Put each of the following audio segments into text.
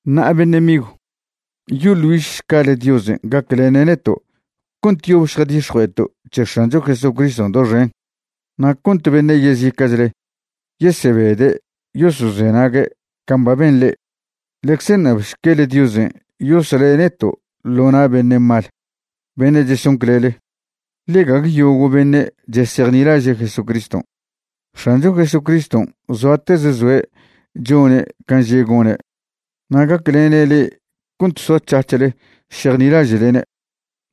Ṉa'a beṉe' migw, yoḻ güižšcale Diosen' gaclene' neto' cont yob šjadix̱jue'eto' c̱he X̱ancho Jesucriston' doxen, na' cont beṉe' yezica'chle yesebede' yosozenague' can' ba ben le'e. Ḻecze ṉabšquele Diosen' yosle' neto' ḻo na' beṉe' mal beṉe' cheson clele, ḻe gague yogo' beṉe' chesejnilaže' Jesucriston'. X̱ancho Jesucriston' zoatez zoe' chone' can' že' gone', na' gaclene' le'e cont soac̱hac̱hle šejnilaže'lene'.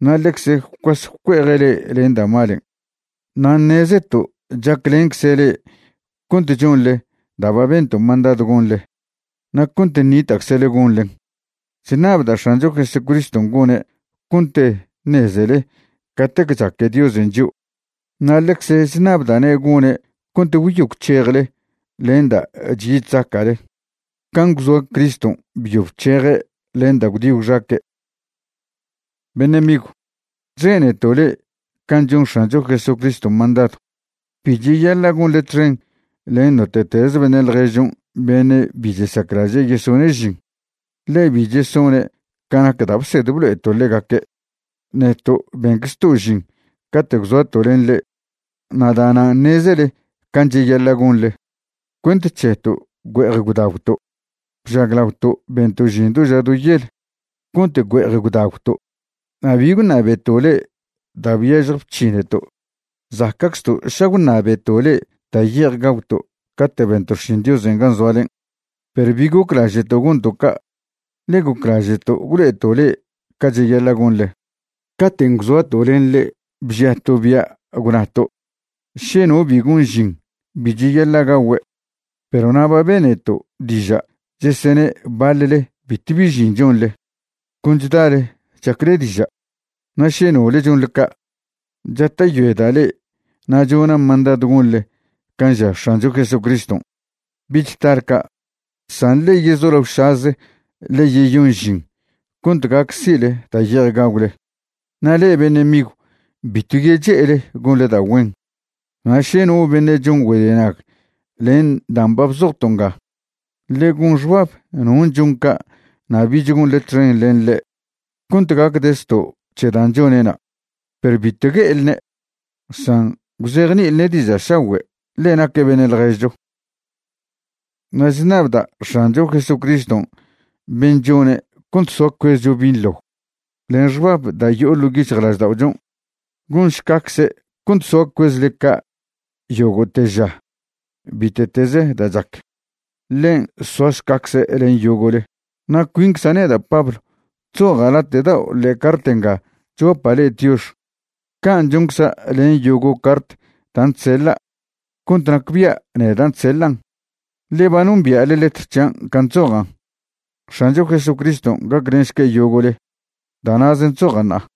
Na' ḻecze gwcuas gwcue'eje' le'e len da' malen'. Na' ṉezeto' chaclencze' le'e cont chonḻe da' ba bento' mandadw gonḻe na' cont ṉita'czle gonḻen. Chṉabda' X̱ancho Jesucriston' gone' cont ṉezele catec chaque Diosen' chio'. Na' ḻecze chṉabda'ne' gone' cont gwyo gwc̱hejle len da' chyi chzaca'le can' gwzoa Criston' byo bc̱heje' len da' gwdi gwxaque'. Beṉe' migw, chzeneto' le'e can' chon X̱ancho Jesucriston' mandadw, bi cheyaḻa' gonḻe txen len note'tez beṉe' ḻježchon' beṉe' bi chesaclaže' yesone' žin, ḻe bi chesone' ca nac da' bsed blo'eto' ḻegaque'. Neto' benczto' žin cate' gwzoato' len le'e, na' da'nan' ṉezele can' cheyaḻa' gonḻe. Cuent c̱heto' güe'ej gwdagwto'. Bžaglaoto' bento' žin do ža do yel cont güe'ej gwdagwto', na' bi gwṉabeto' le'e da' byažje bc̱hineto'. Zaca'czto' ša gwṉabeto' le'e da' ye'ej gagwto' cate' bento' xšin Diosen' gan' zoalen', perw bi goclaže'to' gonto' ca', ḻe goclaže'to' gwlo'eto' le'e ca cheyaḻa' gonḻe. Caten' gwzoato' len le'e bžiato' bia' gwnato': “Še no bi gon žin, bi cheyaḻa' gagüe'.” Perw na' ba beneto' diža' chesene' baḻle bitw bi žin chonḻe, con chdale chacle diža'. Na' še nole chonḻe ca', chata'yoeda' le'e na' chona' mandadw gonḻe can' ža X̱ancho Jesucriston', bich tale ca', san ḻe yezolaošaze ḻe yeyon žin cont gac si'le da' ye'ej gagwle. Na' le'e beṉe' migw, bitw yeche'ele gonḻe da' güen. Na' še no beṉe' chon güedenag len dan' ba bzojto' nga, ḻe gon xbab non' chon ca' na' bich gonḻe txen len ḻe' cont gacde' zto' c̱he dan' chone'na'. Perw bitw gue'elne', san gwzejni'ilne' diža' šagüe', ḻe naque' beṉe' ḻježcho. Na' chṉabda' X̱ancho Jesucriston' ben' chone' cont soa cuezcho binḻo len xbab da' yo'o ḻo' yic̱hjlažda'ochon', gonšcacze' cont soa cuezle ca' yogo'te ža bite'teze da' chac. Ḻen' soašcacze' len yogo'le. Na' cuincza' neda' Pablo chzoja' late' dao' ḻe'e cart nga chguapa' le'e tiox. Can' choncza' len yogo' cart dan' chseḻa' cont nacbia' nedan' chseḻan', ḻe ba nombia'le letr c̱hian' can' chzojan'. X̱ancho Jesucriston' gaclenšque' yogo'le. Da' na'zen' chzoja' ṉa'a.